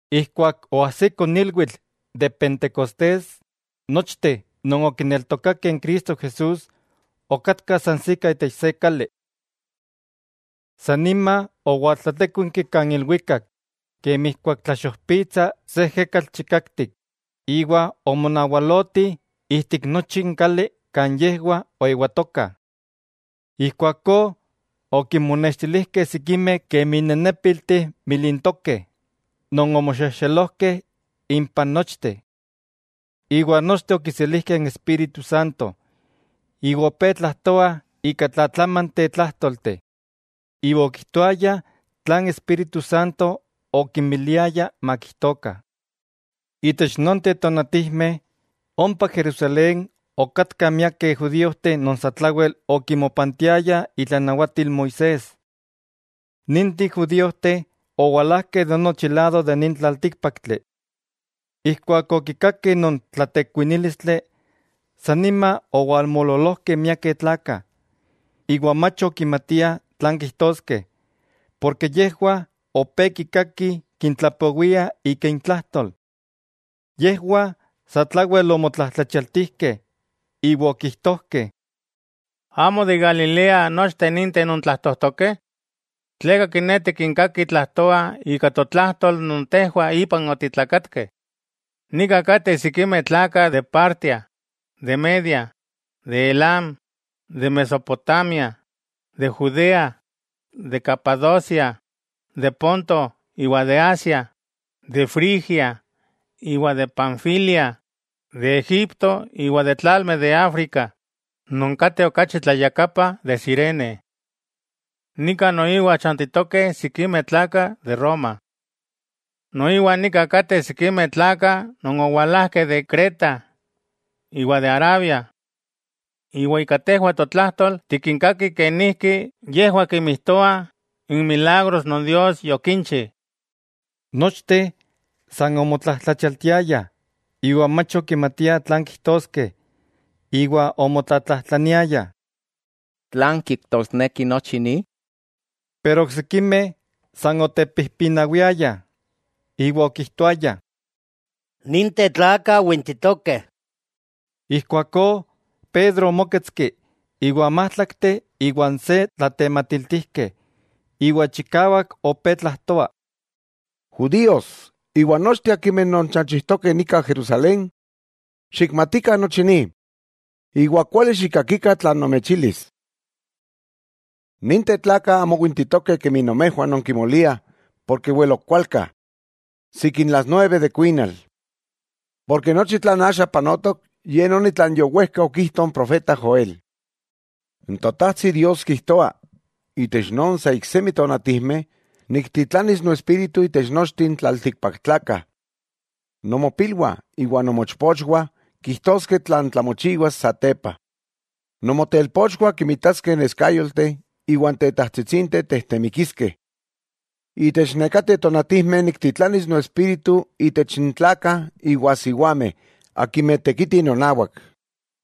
Ijkuak oajsiko n ilwitl de Pentecostés, nochteh non okineltokakeh n Cristo Jesús okatkah sansikah itech se kali. San nima owaltlatékuinki kan ilwikak, kemi ijkuak tlaxojpitsa se ejekatl chikaktik, iwa omonawaloti ijtik nochi n kali kan yejwah oewatokah. Ijkuakó okinmonextilijkeh sikimeh kemi nenépilteh milintokeh non omoxexelojkeh impah nochteh. Iwa nochteh okiselijkeh n Espíritu Santo, iwa opé tlajtoah ika tlatlamanteh tlájtolteh. Iwa okijtoayah tlan n Espíritu Santo okinmiliaya makijtokah. Itech nonteh tonatijmeh, ompa Jerusalén okatkah miakeh judíojteh non satlawel okimopantiayah itlanawatil Moisés. Ninteh judíojteh owalajkeh de nochi lado de nin tlaltíkpaktli. Ijkuak okikakeh non tlatekuinílistli, san nima owalmoololojkeh miakeh tlakah, iwa mach ok okimatiah tlan kijtoskeh, porke yejwah opé kikaki kintlapowiah ika intlajtol. Yejwah satlawel omotlajtlachialtijkeh, iwa okijtojkeh: —¿Amo de Galilea nochteh ninteh non tlajtojtokeh? ¿Tleka kiné, tikinkakih tlajtoah ika totlajtol non tejwah ipan otitlakatkeh? Nika kateh sikimeh tlakah de Partia, de Media, de Elam, de Mesopotamia, de Judea, de Capadocia, de Ponto iwa de Asia, de Frigia iwa de Panfilia, de Egipto iwa de tlalmeh de África, non kateh okachi tlayakapa de Cirene. Nika noiwa chantitokeh sikimeh tlakah de Roma. Noiwa nika kateh sikimeh tlakah non owalajkeh de Creta iwa de Arabia. Iwa ika tejwah totlajtol tikinkakih kenijki yejwah kimijtoah n milagros non Dios yokinchi. Nochteh san omotlajtlachialtiayah iwa mach okimatiah tlan kijtoskeh, iwa omotlatlajtlaniayah: —¿Tlan kijtosneki nochi ni? Pero oksikimeh san otepijpinawiayah, iwa okijtoayah: —¡Ninteh tlakah wintitokeh! Ijkuakó Pedro omóketski iwa n májtlakteh iwa n se tlatematiltijkeh, iwa chikawak opé tlajtoa: —Judíos iwa nochteh akimeh nonchanchijtokeh nika Jerusalén, xikmatikah nochi ni, iwa kuali xikkakikah tlan nomechilis. Ninteh tlakah amo wintitokeh kemi nomejwah nonkimoliah, porke wel ok kualka, sikin las nueve de kuinal. Porke nochi tlan axa panotok, ye noni tlan yowejka okijto n profeta Joel: N Totajtsi Dios kijtoa: Itech sa iksemi tonatijmeh, niktitlanis no Espíritu itech nochteh n tlaltikpaktlakah. Nomopilwah iwa nomochpochwah kijtoskeh tlan tlamochiwas satepa. Nomotelpochwah kinmitaskeh neskayolteh iwa n tetajtsitsinteh tejtemikiskeh. Itech nekateh tonatijmeh niktitlanis no Espíritu itech n tlakah iwa siwameh akimeh tekiti nonawak,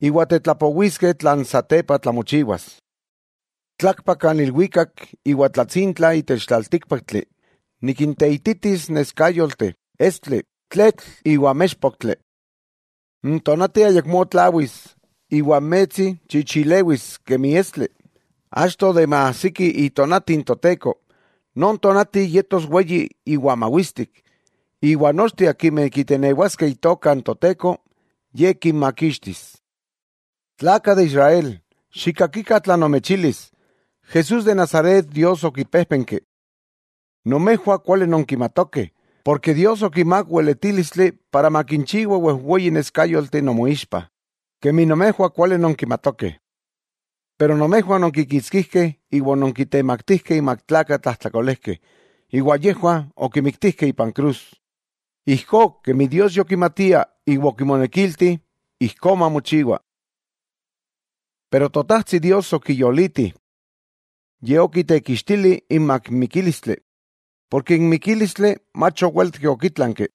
iwa tetlapowiskeh tlan satepa tlamochiwas. Tlakpak kan ilwikak iwa tlatsintla itech tlaltíkpaktli: nikinteititis neskayolteh, estli, tletl iwa méxpoktli. N tonati ayakmó tlawis, iwa n metsi chichilewis kemi estli, achto de maajsiki itonati n Toteko, non tonati yetos weyi iwa mawistik. Iwa nochteh akimeh kitenewaskeh Itoka n Toteko, Ye kinmakixtis. 'Tlakah de Israel, xikkakikah tlan nomechilis: Jesús de Nazaret, Dios okipéjpenki. Nomejwah kuali nonkimatokeh, porke Dios okimák weletílistli para makinchiwa wejweyi neskayolteh nomoixpa, kemi nomejwah kuali nonkimatokeh. Pero nomejwah ononkikitskijkeh iwa ononkitemaktijkeh inmak tlakah tlajtlakolejkeh, iwa yejwah okimiktijkeh ipan krus, ijkó kemi Dios yokimatia iwa okimonekilti ijkó mamochiwa. Pero Totajtsi Dios okiyoliti. Ye okitekixtili imak n mikílistli, porke n mikílistli mach owéletki okítlanki.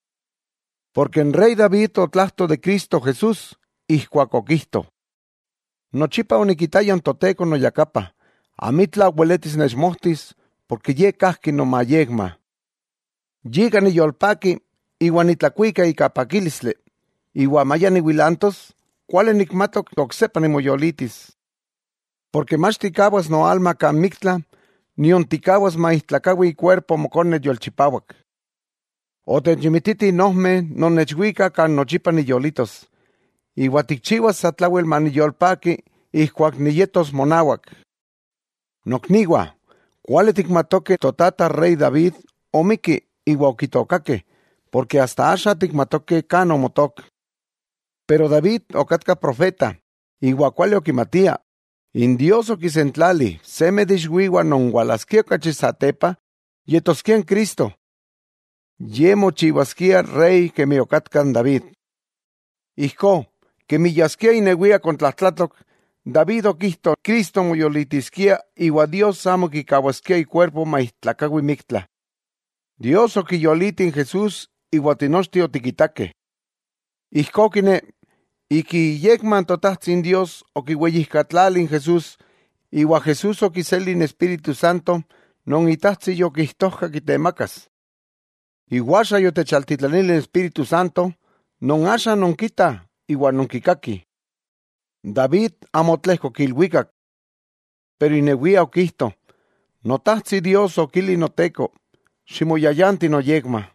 N rey David otlajto de Cristo Jesús ijkuak okijto: Nochipa onikitaya n Toteko noyakapa; amitla weletis nechmojtis, porke ye kajki nomayekma. Yika niyolpaki, iwa nitlakuika ika pakílistli, iwa maya niwilantos, kuali nikmatok oksepa nimoyolitis. Porke mach tikkawas noalma kan miktla, nion tikkawas maijtlakawi ikuerpo Mokone yolchipawak. Otechimititi n ojmeh non nechwikah kan nochipa niyolitos, iwa tikchiwas satlawel maniyolpaki ijkuak niyetos monawak. 'Nokniwah, kuali tikmatokeh totata rey David omikki iwa okitookakeh, porke asta axa tikmatokeh kan omotook. Pero David okatka profeta, iwa kuali okimatia n Dios okisentlali seme de iixwiwah non walaskia okachi satepa yetoskia n Cristo. Ye mochiwaskia rey kemi okatka n David. Ijkó, kemi yaskia inewia kontlajtlatok, David okijto Cristo moyolitiskia iwa Dios amo kikawaskia ikuerpo maijtlakawi miktla. Dios okiyoliti n Jesús iwa tinochteh otikitakeh. Ijkó kiné, ik iyekma Totajtsi Dios okiweyijkatlali n Jesús, iwa Jesús okiseli n Espíritu Santo non Itajtsi yokijtojka kitemakas. Iwa axa yotechaltítlanili n Espíritu Santo non axa nonkitah iwa nonkikakih. David amo otlejkok ilwikak. Pero inewia okijto: Notajtsi Dios okili Noteko: “Ximoyayanti noyekma,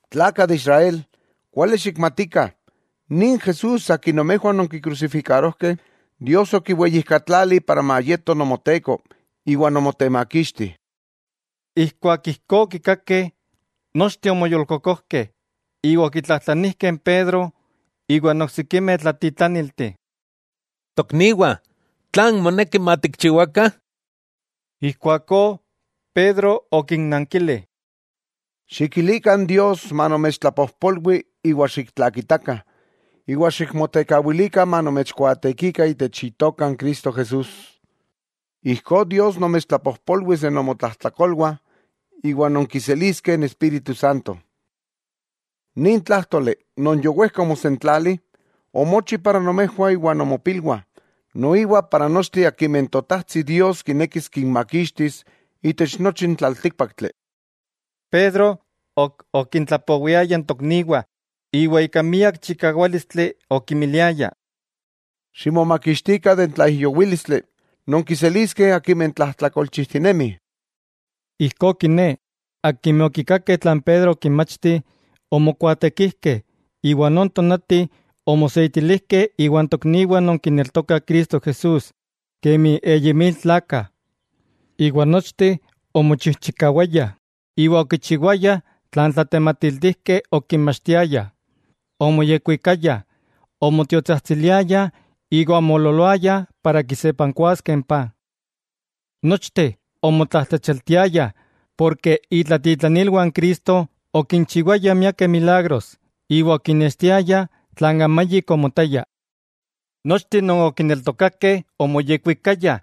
'Tlakah de Israel, kuali xikmatikah, nin Jesús Akin nomejwah ononkikrusifikarojkeh, Dios okiweyijkatlali para mayeto Nomoteko iwa Nomotemakixti. Ijkuak ijkó okikakeh, nochteh omoyolkokojkeh iwa okitlajtlanijkeh n Pedro iwa n oksikimeh tlatitlanilti: —Tokniwah, ¿tlan moneki matikchiwakah? Ijkuakó Pedro okinnankili: —Xikilikah Dios manomechtlapojpolwi iwa xiktlakitakah, iwa ximotekawilikah manomechkuaatekikah itech Itoka n Cristo Jesús, ijkó Dios nomechtlapojpolwis de nomotlajtlakolwah iwa nonkiseliskeh n Espíritu Santo. Nin tlájtoli non yowejka omosentlali omochi para nomejwah iwa nomopilwah, noiwa para nochteh akimeh Totajtsi Dios kinekis kinmakixtis itech nochi n tlaltíkpaktli. Pedro ok okintlapowiaya n tokniwah íwa ika miak chikawálistli okimiliaya: —¡Ximomakixtikah de n tlaijyowílistli non kiseliskeh akimeh tlajtlakolchijtinemih! Ijkó kiné, akimeh okikakeh tlan Pedro okinmachti, omokuaatekijkeh; iwa non tonati omoseitilijkeh iwan tokniwah non kineltokah Cristo Jesús kemi eyi mil tlakah. Iwa nochteh omochijchikawayah iwa okichiwayah tlan n tlatematiltijkeh okinmachtiayah, omoyekwikayah, omotiotsajtsiliayah iwa omoololoayah para kisepankuaskeh n paj. Nochteh omotlajtlachialtiayah, porke itlatitlanilwah n Cristo okinchiwayah miakeh milagros iwa okinextiayah tlan amayik omotaya. Nochteh non okineltokakeh omoyekwikayah,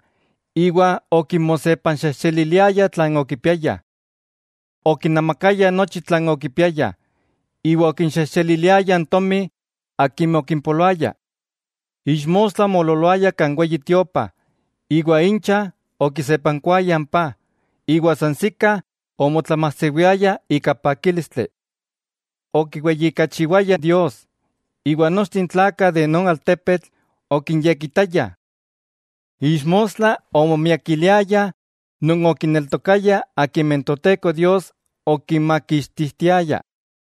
iwa okimosepanxexeliliayah tlan okipiayah. Okinemakayah nochi tlan okipiayah, iwa okinxejxeliliayah n tomi akimeh okimpoloaya. Ixmostla omoololoayah kan Weyi Tiopa, iwa incha okisepankuayah n paj, iwa sansikah omotlamajsewiayah ika pakílistli. Okiweyijkachiwayah Dios, iwa nochteh n tlakah de non altepetl okinyekitayah. Ixmostla omomiakiliayah non okineltokayah akimeh n Toteko Dios okinmakixtijtiaya.